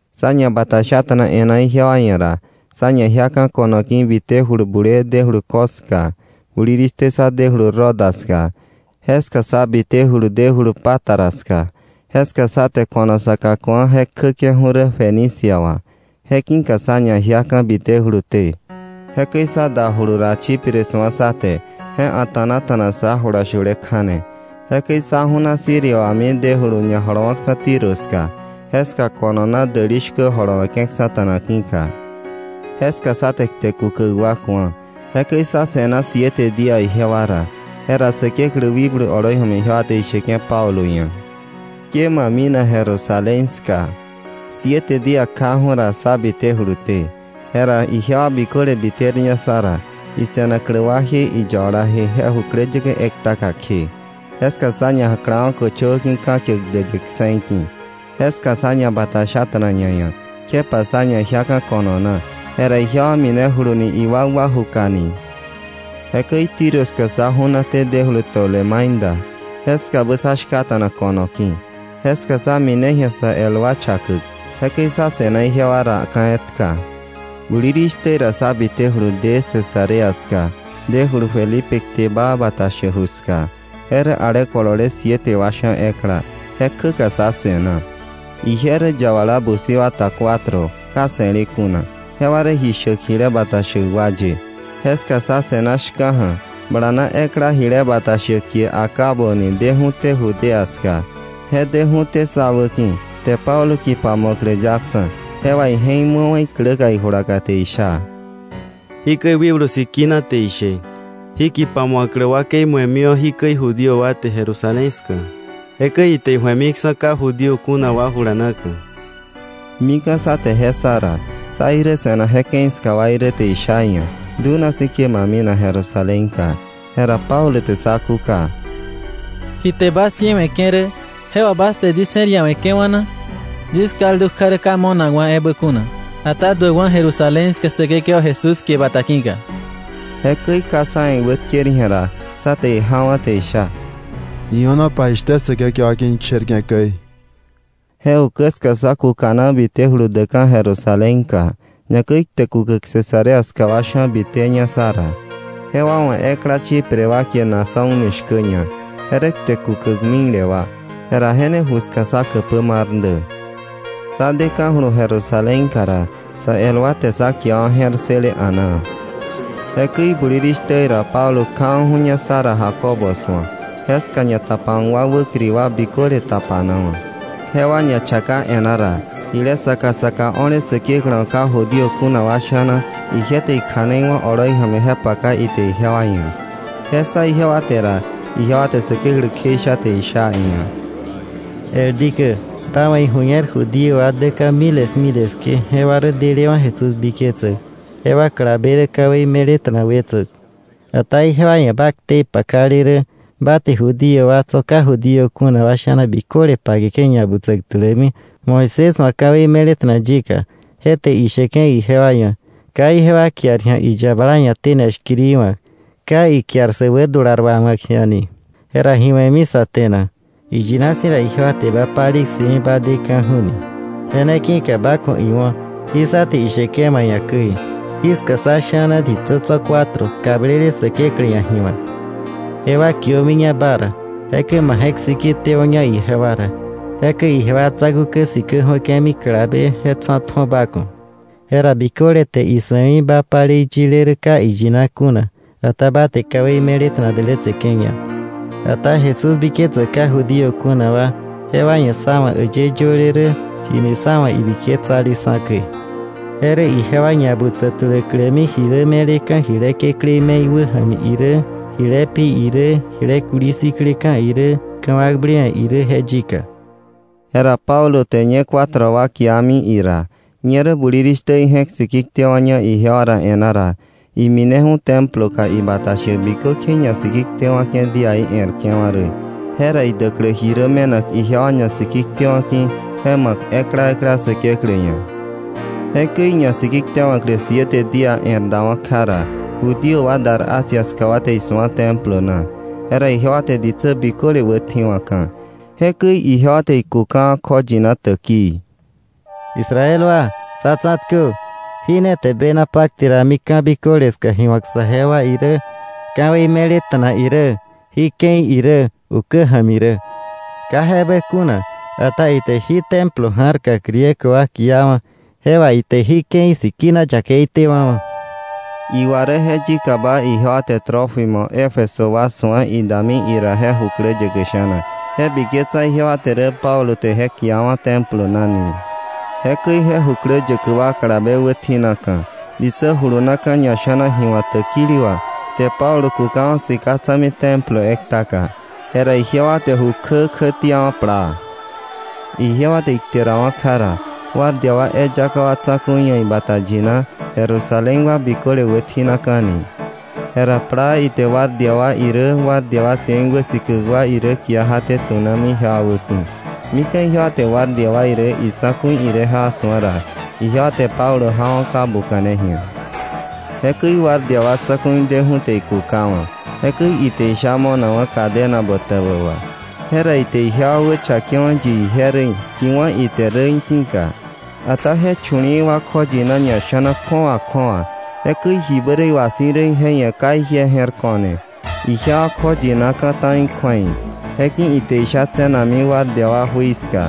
Sá ñabatashata̱na e̱ná ijewa ia̱ ra, sá ñajiaka̱ ko̱no ki̱ bitéjulu bulee dejulu Cos ska. Bulirishtä sá dejulu Roda ska. Jeska sá bitejulu dejulu Pátara ska. Jeska sá te ko̱no saka ku̱a je kjäke̱ju̱ rä Fenicia wà. Je ki̱ka sá ñajiaka̱ bitejuluté. Jekäi sá dajulu ra Chipre su̱a sá te. Je a̱ta̱nata̱na sá jula shule kja̱ne. Jekäi sá ju̱na Siria wami dejulu ñajolowa̱ksa̱ Tiro ska, jeska ko̱no na däli shkä jolowe̱ke̱ksa̱ta̱na ki̱ka. Jeska sá te kte kukäk wa ku̱a. Jekäi sá se̱na siete día ijewa ra. Jera Säkeklä wikblu oloi ja̱mi ijewa te isheke̱ Pablo ia̱: “Ke ma minak Jerusalén ska.” Siete día kjaju̱ ra, sá bitejuluté. Jera ijewa biköle biterña sá ra, ise̱naklä waje iyabalaje je jukläyäkä ektaka kje. Jeska sá ñajaklawa̱ köchöwä ki̱ ka̱kiäk däyë kse̱i ki̱. Jeska sá ñabatashata̱na ñaia̱, kjepa sá ñajiaka̱ ko̱no na. Jera ijewa minejulumini iwakwa jukani. Jekäi Tiro ska sá ju̱naté dejulu Tolemaida. Jeskabä sa shkata̱na kono ki̱. Jeska sá mine ji̱a sa el wa chakäk, jekäi sá se̱na ijewa ra ka̱ etka. Bulirishtä ra sá bitejulu de Cesarea ska, dejulu Felipe kte baa bata shäk ju ska. Je rä ale kolole siete wa sha̱ ekla. Je kjäka sá se̱na. Ije rä yabala busi wa ta cuatro, ka se̱le kuna. Jewa rä ji shäk jile bata shäk wa ye. Jeska sá se̱na shka̱ja̱, bala na ekla jile bata shäk kie Agabo ni biteju̱té Judea ska. Je deju̱té sá wäki̱, te Pablo kipa mu̱aklä yaksa̱, je wà ije̱k mu̱awa̱ ikläka ijulaka, te isha: —Jikäi Wikblu Sikina te ishe: “Jí kipa mu̱aklä wakei mu̱emiwa̱ jikäi Judío wa te Jerusalén ska. Jekäi ite iju̱emiksa̱ ka Judío kuna wa jula na.” Mika̱ sá te je ssa ra, sá irä se̱nak je ke̱i ska wa irä te isha iia̱: —Dunasi̱ ke ma minak Jerusalénka. Jera Pablo te sá kúka: —¿Ji te bas jiewe̱ke̱ rä je wà bas te yis je̱r iawe̱ke̱wa̱ na? Yis kaldu kja rä ka mo̱nakwa̱ ebä kuna, ata duäkwa̱ Jerusalén ska Säkekewa Jesús kie bata ki̱ka. Jekäi ka sá ia̱ iwätker ji̱a ra, sá te ijawa̱ te isha: —Io̱nopa jishtä Säkekewa ki̱ isherke̱ käi. Je ukä ska sá kukana bitejulu däkka̱ Jerusalénka. Ñakäi kte kukäk Cesarea ska wa sha̱ biteña sá ra. Jewa wa̱ ekla Chipre wa kie Mnasón ni shkäña. Je rä kte kukäk mikle wa, jera je ne ju ska sá käpä mar dä. Sá deka̱julu Jerusalénka ra, sä el wa te sá kiawa̱ je̱r ssële a̱naa. Jekäi bulirishtä ra Pablo kjawa̱ju̱ña sá ra Jacobo su̱ak. Jeska ñatapawa̱k wa wäkiri wa biköle tapanawa̱. Jewa ñachaka e̱ná ra, jile saka saka o̱le Säkeklä wa̱ ka Judío kuna wa sha̱na ije te ikja̱nei wá̱ oloi ja̱mi je paka ite ijewa ia̱. Je ssa ijewa te ra, ijewa te Säkeklä kjeisha, te isha iia̱: —El dikä, ba wa̱ iju̱ñer, Judío wa däka̱ miles miles kje, jewa rä delewa̱ Jesús biketsäk. Jewa kalabe rä ka̱wei me̱leta̱na wetsäk. Ata ijewa ia̱ ba ktei pakale rä ba te Judío wa tso̱ ka Judío kuna wa sha̱na biköle pakeke̱ ñabutsäk tulämi Moisés wa̱ ka̱wei me̱leta̱na yika, te isheke̱ ijewa ia̱, ka ijewa kiar ji̱a iyabala ia̱ tene shkiri wa̱k, ka ikiar sä wädular wawa̱k ji̱a ni. ¿Jera ji we̱mi sa te na? Iyina si̱ ra ijewa te ba palei ssëmi ba deka̱ju̱ ni. Je ne ki̱ka ba ku̱ iwo̱ jí sá te isheke̱ ma ia̱ käi. Jiska sá sha̱na ditsä tso̱ cuatro kablele Säkeklä ia̱ ji wa̱k. Jewa kiömiña ba ra, jekäi ma je̱k siki tewo̱ña ijewa ra. Jekäi ijewa tsa̱ku̱ kä sikä ju̱ake̱mi kalabe tsa̱tju̱o ba ku̱. Jera biköle te isu̱emi ba palei yile rä ka iyina kuna, ata ba te ka̱wei me̱leta̱na dälätseke̱ña. Ata Jesús biketsäk ka Judío kuna wa, jewa ia̱ sa̱ wa̱ äyë yöle rä jini sa̱ wa̱ ibiketsaleksa̱ käi. Je rä ijewa ñabutsä tuläklämi ji rä me̱leka̱ jile kekläí me̱i wäja̱mi irä, jile pi irä, jile kuli sikleka̱ irä, ka̱wakblewe̱ irä je yika. Jera Pablo te ñe cuatro wa kiami ira. Ñerä bulirishtä ije̱k siki tewa̱ña ijewa ra e̱ná ra, imineju̱ Temploka ibata shäk bikökje iñasikitewa̱ke̱ díaí e̱rke̱wa̱ rä, jera idäklä ji rä me̱nak ijewa ñasikitewa̱ ki̱ je ma̱k ekla ekla Säkeklä ia̱. Jekäi iñasikitewa̱klä siete día e̱r dawa̱ kja ra, Judío wa dar Asia ska wa te isu̱a Templo na. Jera ijewa te ditsä biköle wätji̱wa̱ka̱. Jekäi ijewa te ikukawa̱, kjoyina täkii: “¡Israel wa, sá tsa̱tkö! Jí ne te bena pakte rami ka̱ biköle ska ji wa̱k saje wa irä, ka̱wei me̱leta̱na irä, jí ke̱i irä ukä ja̱mi rä. Ka je ebä kuna, ata ite jí Templo ja̱rka Griego wa kiawa̱ je wà ite jí ke̱i sikina yakeitewa̱wa̱.” Iwa rä je yikaba ijewa te Trófimo Éfeso wa su̱a idami ira je jukläyäkä sha̱na, je biketsa ijewa te rä Pablo te je kiawa̱ Templo na ni. Jekäi je jukläyäkä wa kalabe wätji̱naka̱, ditsä julunaka̱ ñasha̱na ji wa̱k täkili wà, te Pablo kukawa̱ sika tsa̱mi Templo ektaka. Jera ijewa te ju kjä kjätiawa̱ plaa. Ijewa te ikterawa̱ kja ra, guardia wa eyaka wa tsa̱ku̱i ia̱ ibata yina, Jerusalén wa biköle wätji̱naka̱ ni. Jera plaa ite guardia wa irä guardia wa cien wäsikäk wa irä kia jaté, tunami ijewa wäki̱. Mika̱ ijewa te guardia wa irä itsa̱ku̱i irä jewa su̱a ra, ijewa te Pablo jawa̱ ka buka̱ne ji̱a. Jekäi guardia wa tsa̱ku̱i deju̱ te ikukawa̱. Jekäi ite isha mo̱nakwa̱ cadena botäbä wà. Jera ite ijewa wächakewa̱ yi ije rä í̱, ji wá̱ ite rä í̱ ki̱ka. Ata je chu̱li̱i̱ wa kjoyina ñasha̱naka kju̱awa kju̱awa. Jekäi jibä iwà si̱ rä je ia̱ ka ije je̱r ko̱ne, ijewa kjoyinaka̱ ta̱i kju̱ei. Je ki̱ka ite isha tse̱nakmi guardia wa jui ska.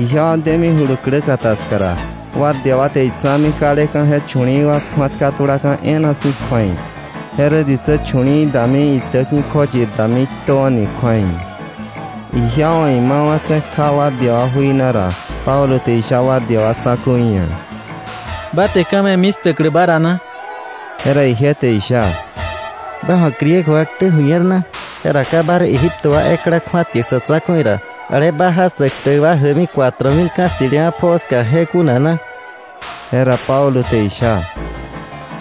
Ijewa demijulu kläkata ska ra, guardia wa te itsa̱mi kaleka̱ je chu̱li̱i̱ wa kju̱atka tulaka̱ e̱e̱na si̱ kju̱ei. Je rä ditsä chu̱li̱i̱ wa dami itäki̱ka kjoyir dami: “Iktöwa̱” ni kju̱ei. Ijewa wa̱ imawa̱tse̱ kja guardia wa jui na ra, Pablo te isha guardia wa tsa̱ku̱i ia̱: —¿Ba te ka̱ me̱mi 'stäklä ba ra na? Jera ije te isha: —¿Ba wa̱ Griego wa ktä ju̱ñer na? Jera ¿ka ba rä Egipto wa ekla kju̱atkäk sa̱ tsa̱ku̱i ra ale bajaa sä ktäk wa jäkmi cuatro mil ka̱ ssi̱lewa̱ pjoo ska je kuna na? Jera Pablo te isha: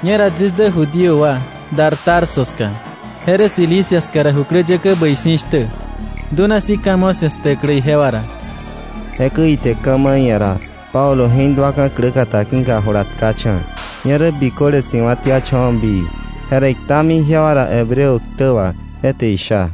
—Ñera yis dä Judío wa, dar Tarso ska, je rä Cilicia ska ra jukläyäkä bäi si̱ shtä. Dunasi̱ ka̱ mo̱ 'sia̱, 'sktäklä ijewa ra. Jekäi ite ka̱ ma̱ iia̱ ra, Pablo je̱k duaka̱ kläkata ki̱ka, jula tkacha̱. Ñerä biköle si̱wa̱tiacha̱wa̱ bii, jera iktami ijewa ra Hebreo tä wa, je te isha: